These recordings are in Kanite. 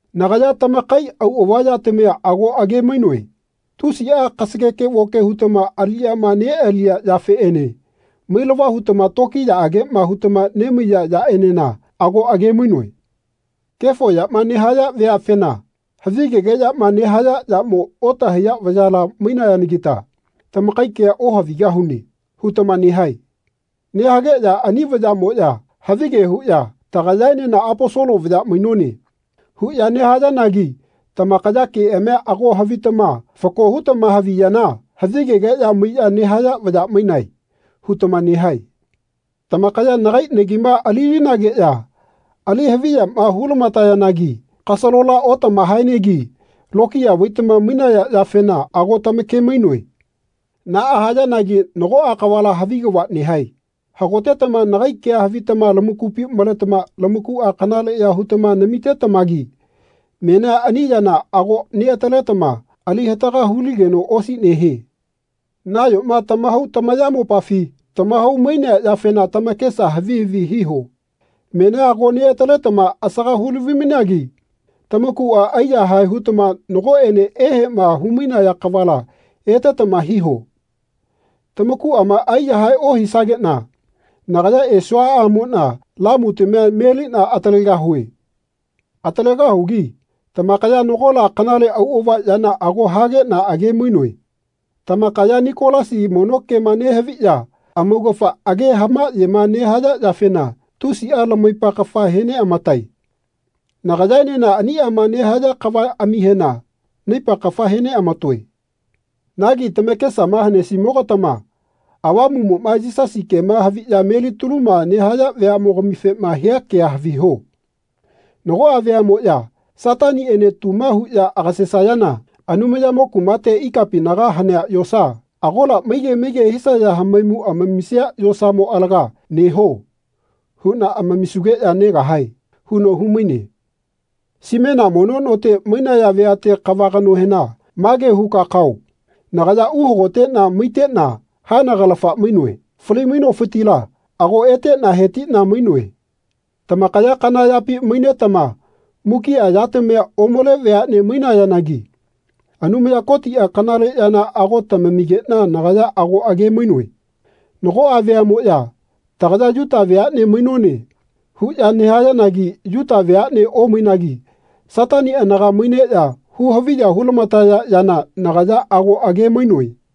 Nagaya tamakai auꞌava yatamia ago age-mainoe. Tusiꞌa kasageke-voke hutama aliꞌyama neꞌaliya yafeꞌene mailava hutama tokiyaꞌageꞌma hutama nemaiya yaꞌenena ago age-mainoe. Kefo yama nehaya veafena “Havigegeꞌyama nehaya yamo otahaiya vayala mainayanagita tamakai kea ohavigahune.” hutama nehae. Nehageꞌya ani vayaꞌmoꞌya havige huꞌya “Tagayaenena Aposolo vaya mainone.” huꞌya nehayanagi tamakaya keꞌamia ago havitama fako hutama haviyana “Havigegeꞌya maiꞌya nehaya vaya mainae.” hutama nehae. Tamakaya nagai nagima alilinageꞌya ali haviyama hulamatayanagi kasalola otamahaenegi lokiya vaitama mainaya yafena ago tamake-mainoe. Naꞌa nehayanagi nagoꞌa kavala havi kava nehae. Hagotetama nagai kea havitama lamakupi maletama tamakuꞌa kanaleꞌya hutama namitetamagi menia ani yana ago neꞌataletama ali hataga huligeno osi nehie. Nayoma tamahau tamayamopafi tamahau-mainea yafena tamakesa havi havi hiho. Menia ago neꞌataletama asaga hulavi-mainagi tamakuꞌa aiyahae hutama nagoꞌene eheꞌma humainaya kavala etetama hiho. Tamakuꞌama aiyahae ohisageꞌna nagaya esuaꞌamoꞌna lamutamia meliꞌna atalegahue. Atalegahugi tamakaya nagola kanale auꞌava yana ago hageꞌna age-mainoe. Tamakaya Nikolasi mono kema nehaviꞌya amaugafa age hamaꞌyema nehaya yafena tusiꞌa lamaipa kafa he neꞌamatae. Nagayaenena aniꞌama nehaya kavaꞌamihena naipa kafa he neꞌamatoe. Nagi tamakesama hanesimogatama Avamuꞌmoꞌma Yisasi kema haviya melitaluma nehaya veaꞌmogamifema hia kea haviho. “Nagoꞌa veaꞌmoꞌya Sataniꞌene tuma huꞌya agasesayana Anumayamo kumate ikapinaga hanea yosa, agola maige maige hisaya hamaimu amamisia yosamo alaga ‘Neho.’ huꞌna amamisugeꞌya negahae.” huno humaine. Simena mono note mainaya veate kava kanohena mage huka kao nagaya uhagoteꞌna maiteꞌna haenagalafana mainoe. Fali-mainofitila ago eteꞌna hetiꞌna mainoe. Tamakaya kana yapi mainetama mukiꞌa yatamia omale veaꞌne mainayanagi Anumaya Kotiꞌa kanale yana ago tamamigeꞌna nagaya ago age-mainoe. Nagoꞌa veaꞌmoꞌya “Tagaya Yuta veaꞌne mainone.” huꞌya nehayanagi Yuta veaꞌnea omainagi Satani anaga maineꞌya huhaviya hu-lamataya yana nagaya ago age-mainoe.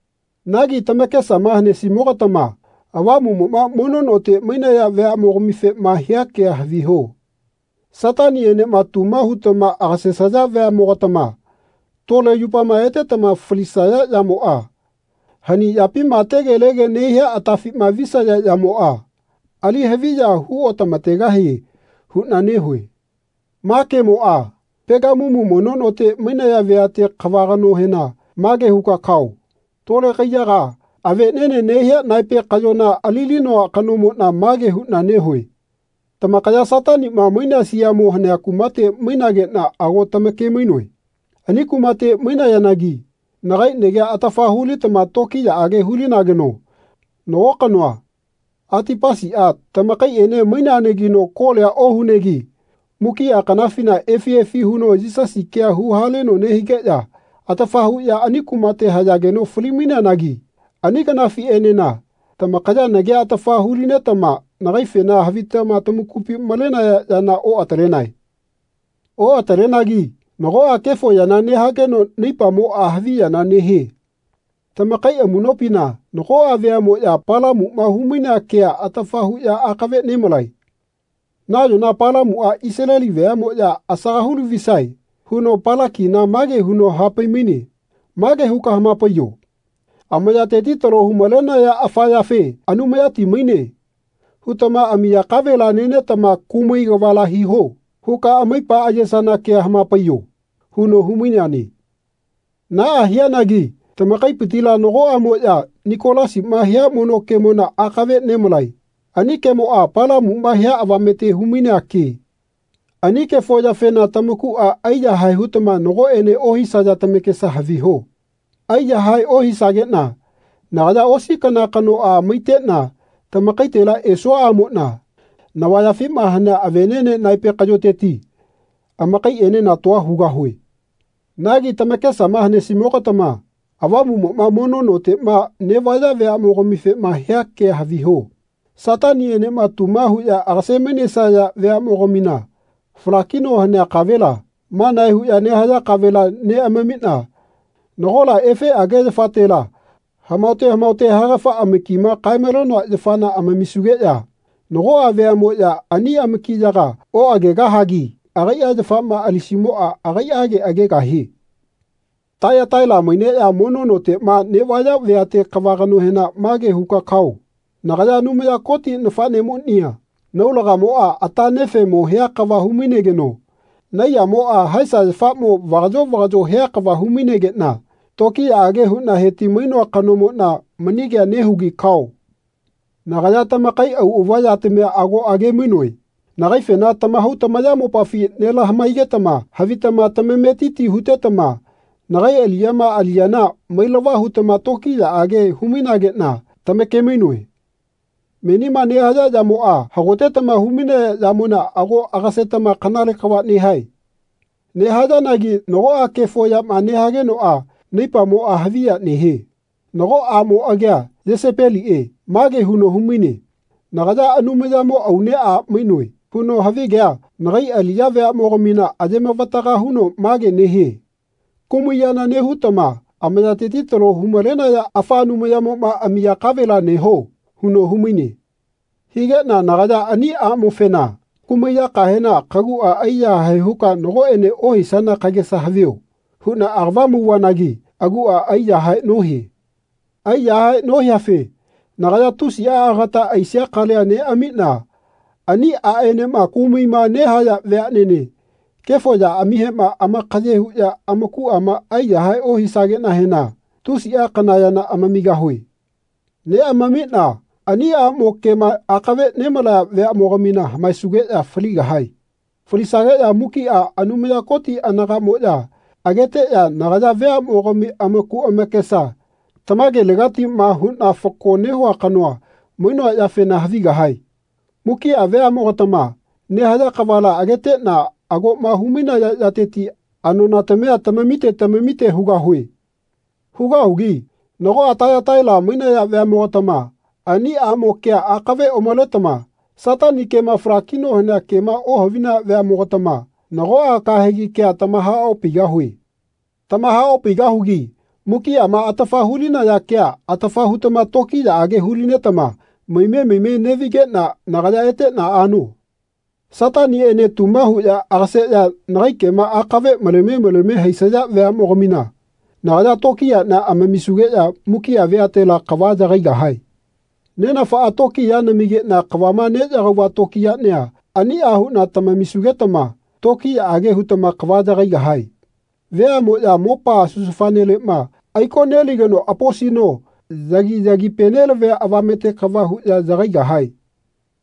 Nagi tamakesama hanesimogatama Avamuꞌmoꞌma mono note mainaya veaꞌmogamifema hia kea haviho. “Sataniꞌenema tuma hutama agasesaya veaꞌmogatama tole yupama etetama falisaya yamoꞌa, hani yapima tegelege nehia atafina visaya yamoꞌa, ali haviya hu otamategahie huꞌna nehue.” Ma kemoꞌa Pegamumu mono note mainaya veate kava kanohena mage huka kao tole kaiyaga aveꞌneꞌne nehia naepe kaꞌyona alilinoa kanomoꞌna mage huꞌna nehue. Tamakaya Sataniꞌma mainea siamo hanea kumate mainageꞌna ago tamake-mainoe. Ani kumate mainayanagi nagai nagia atafa hulitama tokiyaꞌage hulinageno nago kanoa, Atipasiꞌa, tamakaiꞌene maineanagino kolia ohunegi mukiꞌa kanafina efi efi huno Yisasi kea huhaleno nehigeꞌya atafa huꞌya ani kumate hayageno fali-maineanagi ani kanafiꞌenena tamakaya nagia atafa hulinetama nagaifena havitama tamakupi malenaya yana oꞌatalenae. Oꞌatalenagi nagoꞌa kefo yana nehageno naipamoꞌa haviyana nehie. Tamakai amuꞌnopina nagoꞌa veaꞌmoꞌya Palamuꞌma humainea kea atafa huꞌya akave nemalae. Nayona Palamuꞌa Isaleli veaꞌmoꞌya asaga hu lavisae huno Palakina mage huno hapai-maine “Mage huka hamapaiyo ‘Amayateti talo humalenaya afa yafe ‘Anumayati maine.’ hutama amiya kavela nenetama kumai kavala hiho.’ huka amaipa ayesana kea hamapaiyo.” huno humaineane. Naꞌa hianagi tamakaipitila nagoꞌamoꞌya Nikolasiꞌma hia mono kemona akave nemalae. Ani kemoꞌa Palamuꞌma hia avamete humainea ke. Ani kefo yafena tamakuꞌa aiyahae hutama nagoꞌene ohisaya tamakesa haviho. Aiyahae ohisageꞌna nagaya osi kana kanoꞌa maiteꞌna tamakaitela esuaꞌamoꞌna navayafima hanea aveꞌneꞌne naepe kaꞌyoteti amakaiꞌenena tua hugahue. Nagi tamakesama hanesimogatama Avamuꞌmoꞌa mono noteꞌma neꞌvaya veaꞌmogamifema hia kea haviho. Sataniꞌenema tuma huꞌya agase-mainesaya veaꞌmogamina falakino hanea kavela, manae huꞌya nehaya kavela neꞌamamiꞌna nagola efeꞌage yafatela hamaote hamaote haegafa amakima kae-malenoa yafana amamisugeꞌya nagoꞌa veaꞌmoꞌya ani amakiyaga oꞌagegahagi agaiꞌa yafama alisimoꞌa agaiꞌage agegahie. Taiyataila maineꞌya mono noteꞌma neꞌvaya veate kava kanohena mage huka kao nagaya Anumaya Koti nafaꞌnemonia naulagamoꞌa ata nefeꞌmo hia kava humainegeno naiyamoꞌa haesa yafamo vagaꞌyo vagaꞌyo hia kava humainegeꞌna tokiyaꞌage huꞌna heti-mainoa kanomoꞌna mani kea nehugi kao. Nagaya tamakai auꞌava yatamia ago age-mainoe. Nagaifena tamahau tamayamopafi nelamahaigetama havitama tamametiti hutetama nagai aliꞌyama aliyana mailava hutama tokiyaꞌage humainageꞌna tamake-mainoe. Menima nehaya yamoꞌa hagotetama humainaya yamona ago agasetama kanale kava nehae. Nehayanagi nagoꞌa kefo yama nehagenoꞌa naipamoꞌa haviya nehie. Nago aꞌmo agia Yesepeliꞌe mage huno humaine “Nagaya Anumayamo aune a mainoe.” huno havigea nagai aliꞌya veaꞌmogamina ayemavataga huno mage nehie “Kumai yana nehutama amayateti talo humalenaya afa anumayamoma amiya kavela neho.” huno humaine. Higeꞌna nagaya ani aꞌmofena “Kumai yakahena kaguꞌa aiyahae huka nagoꞌene ohisana kagesa havio.” huꞌna agava mauvanagi aguꞌa aiyahae nohie. Aiyahae nohiafe nagaya tusiꞌa agata aisia kalia neꞌamiꞌna ani aꞌenema kumaima nehaya veaꞌnene kefo yaꞌamihema amakaye huꞌya amakuꞌama aiyahae ohisageꞌnahena tusiꞌa kana yana amamigahue. Neꞌamamiꞌna ani aꞌmo kema akave nemalaya veaꞌmogamina hamaesugeꞌya faligahae. Falisageꞌya mukiꞌa Anumaya Koti anagaꞌmoꞌya ageteꞌya nagaya veaꞌmogami amaku amakesa tamagelegatiꞌma huꞌna fako nehua kano mainoa yafena havigahae. Mukiꞌa veaꞌmogatama nehaya kavala ageteꞌna agoꞌma humainaya yateti anonatamia tamamite lamamite hugahue. Hugahugi nagoꞌa Taiyataila mainaya veaꞌmogatama ani aꞌmo kea akave omaletama Satani kema falakino hanea kema ohavinaya veaꞌmogatama nagoꞌa kahegi kea tamahaopaigahue. Tamahaopaigahugi mukiꞌama atafa hulinaya kea atafa hutama tokiyaꞌage hu-linetama maime maime neꞌvigeꞌna nagaya eteꞌna ano. Sataniꞌene tuma huꞌya agaseꞌya nagai kema akave maleme maleme haisaya veaꞌmogamina nagaya tokiyaꞌnia amamisugeꞌya mukiꞌa veatela kava yagaigahae. Nenafaꞌa tokiya namigeꞌna kavama neꞌyagauva tokiyaꞌnia aniꞌa huꞌna tamamisugetama tokiyaꞌage hutama kava yagaigahae. Veaꞌmoꞌya mopa susufaneleꞌma aiko neligeno aposino yagi-yagipe nelavia avamete kava huꞌya yagaigahae.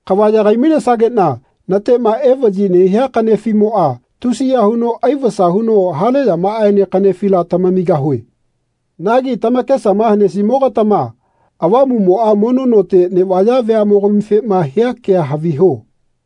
Kava yagai-mainesageꞌna natema evaꞌyi nehia kaꞌnefiꞌmoꞌa tusiya huno aivasa huno hale yamaene kaꞌnefila tamamigahue. Nagi tamakesama hanesimoga-tama Avamuꞌmoꞌa mono note neꞌvaya veaꞌmogamifema hia kea haviho.